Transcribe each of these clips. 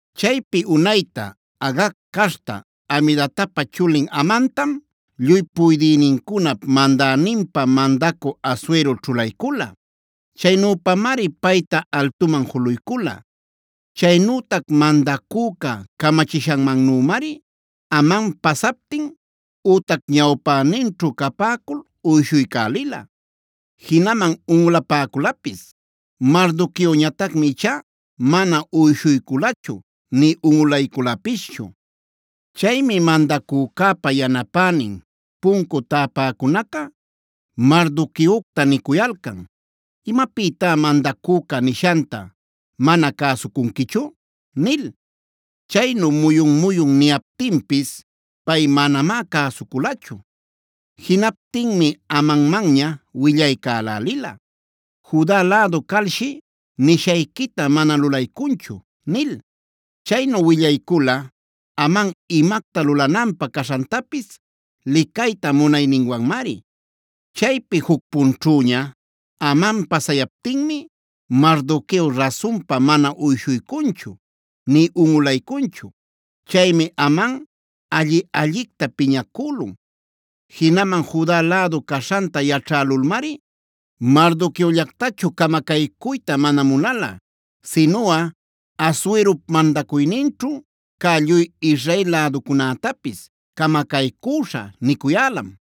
Chaypi unayta Agag caśhta Hamedatapa chulin Amantam, lluy puydïnincunap mandäninpä mandacü Asuero ćhulaycula. Chaynüpamari payta altuman juluycula. Chaynütac mandacüca camachishanmannümari Aman pasaptin ütac ñawpäninćhu capäcul uyshuycälila jinaman unꞌulapäculapis. Mardoqueoñatacmi ichá mana uyshuyculachu nï unꞌulayculapischu. Chaymi mandacücäpa yanapänin puncu täpäcunaca Mardoqueocta nicuyalcan: “¿Imapïtá mandacüca nishanta mana cäsucunquichu?” nil. Chaynu muyun-muyun niyaptinpis pay manamá cäsuculachu. Jinaptinmi Amanmanña willaycälälila: “Juda lädu calshi nishayquita mana lulaycunchu” nil. Chaynu willaycula Aman imacta lulananpä caśhantapis licayta munayninwanmari. Chaypi juc punćhüña Aman pasayaptinmi Mardoqueo rasunpa mana uyshuycunchu nï unꞌulaycunchu. Chaymi Aman alli-allicta piñacülun. Jinaman Juda lädu caśhanta yaćhälulmari Mardoqueollactachu camacaycuyta mana munala, sinuꞌa Asuerop mandacuyninćhu cä lluy Israel läducunätapis “camacaycüśhä” nicuyälam.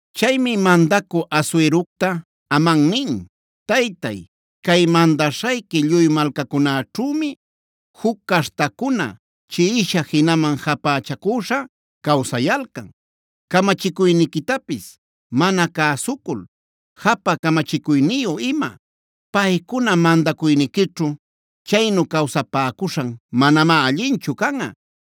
Chaymi mandacü Asuerocta Aman nin: “Taytay, cay mandaśhayqui lluy malcacunäćhümi juc caśhtacuna chiꞌisha jinaman japächacüśha cawsayalcan, camachicuyniquitapis mana cäsucul, japä camachicuyniyu ima. Paycuna mandacuyniquićhu chaynu cawsapäcuśhan manamá allinchu canꞌa.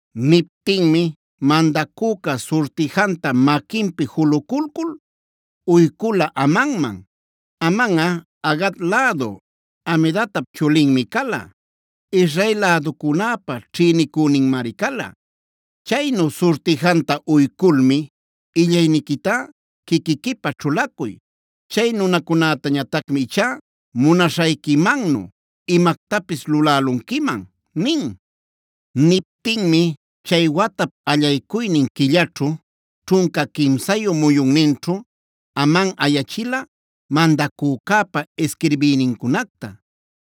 Niptinmi mandacüca surtijantab maquinpi juluculcul uycula Amanman. Amanꞌa Agag lädu Hamedatap chulinmi cala; Israel läducunäpa ćhïnicüninmari cala. Chaynu surtijanta uyculmi: “Illayniquitá quiquiquipä ćhulacuy. Chay nunacunätañatacmi ichá munaśhayquimannu imactapis lulälunquiman” nin. Niptinmi chay watap allaycuynin quillaćhu, ćhunca quimsa muyunninćhu Aman ayachila mandacücäpa isquirbïnincunacta.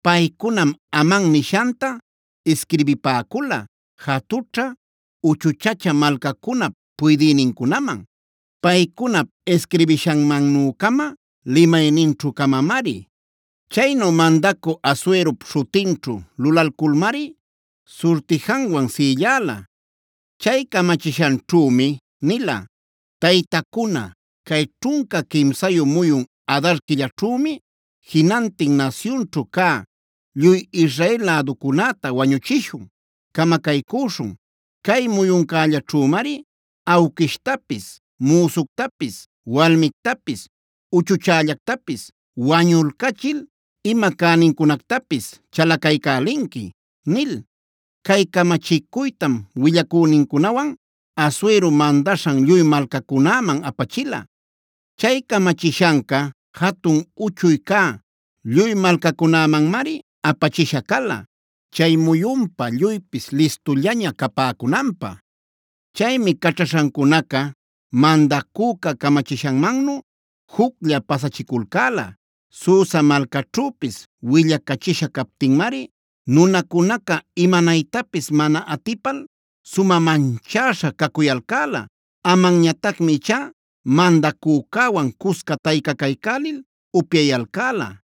Paycunam Aman nishanta isquirbipäcula jatućhä, uchuchä malcacunap puydïnincunaman, paycunap isquirbishanmannu-cama limayninćhu-camamari. Chaynu mandacü Asuerop śhutinćhu lulalculmari surtijanwan sïllala. Chay camachishanćhümi nila: “Taytacuna, cay ćhunca quimsayu muyun Adar quillaćhümi, jinantin nasyunćhu cä lluy Israel läducunäta wañuchishun, camacaycüśhun. Cay muyuncällaćhümari awquishtapis, müsuctapis, walmictapis, uchuchällactapis wañulcachil ima cänincunactapis chalacaycälinqui” nil. Cay camachicuytam willacünincunawan, Asuero mandaśhan lluy malcacunäman apachila. Chay camachishanca jatun uchuy cä lluy malcacunämanmari apachisha cala, chay muyunpa lluypis listullaña capäcunanpä. Chaymi caćhaśhancunaca mandacüca camachishanmannu juclla pasachiculcäla. Susa malcaćhüpis willacachisha captinmari nunacunaca imanaytapis mana atipal sumä manchäśha cacuyalcäla. Amanñatacmi ichá mandacücäwan cusca taycacaycälil upyayalcäla.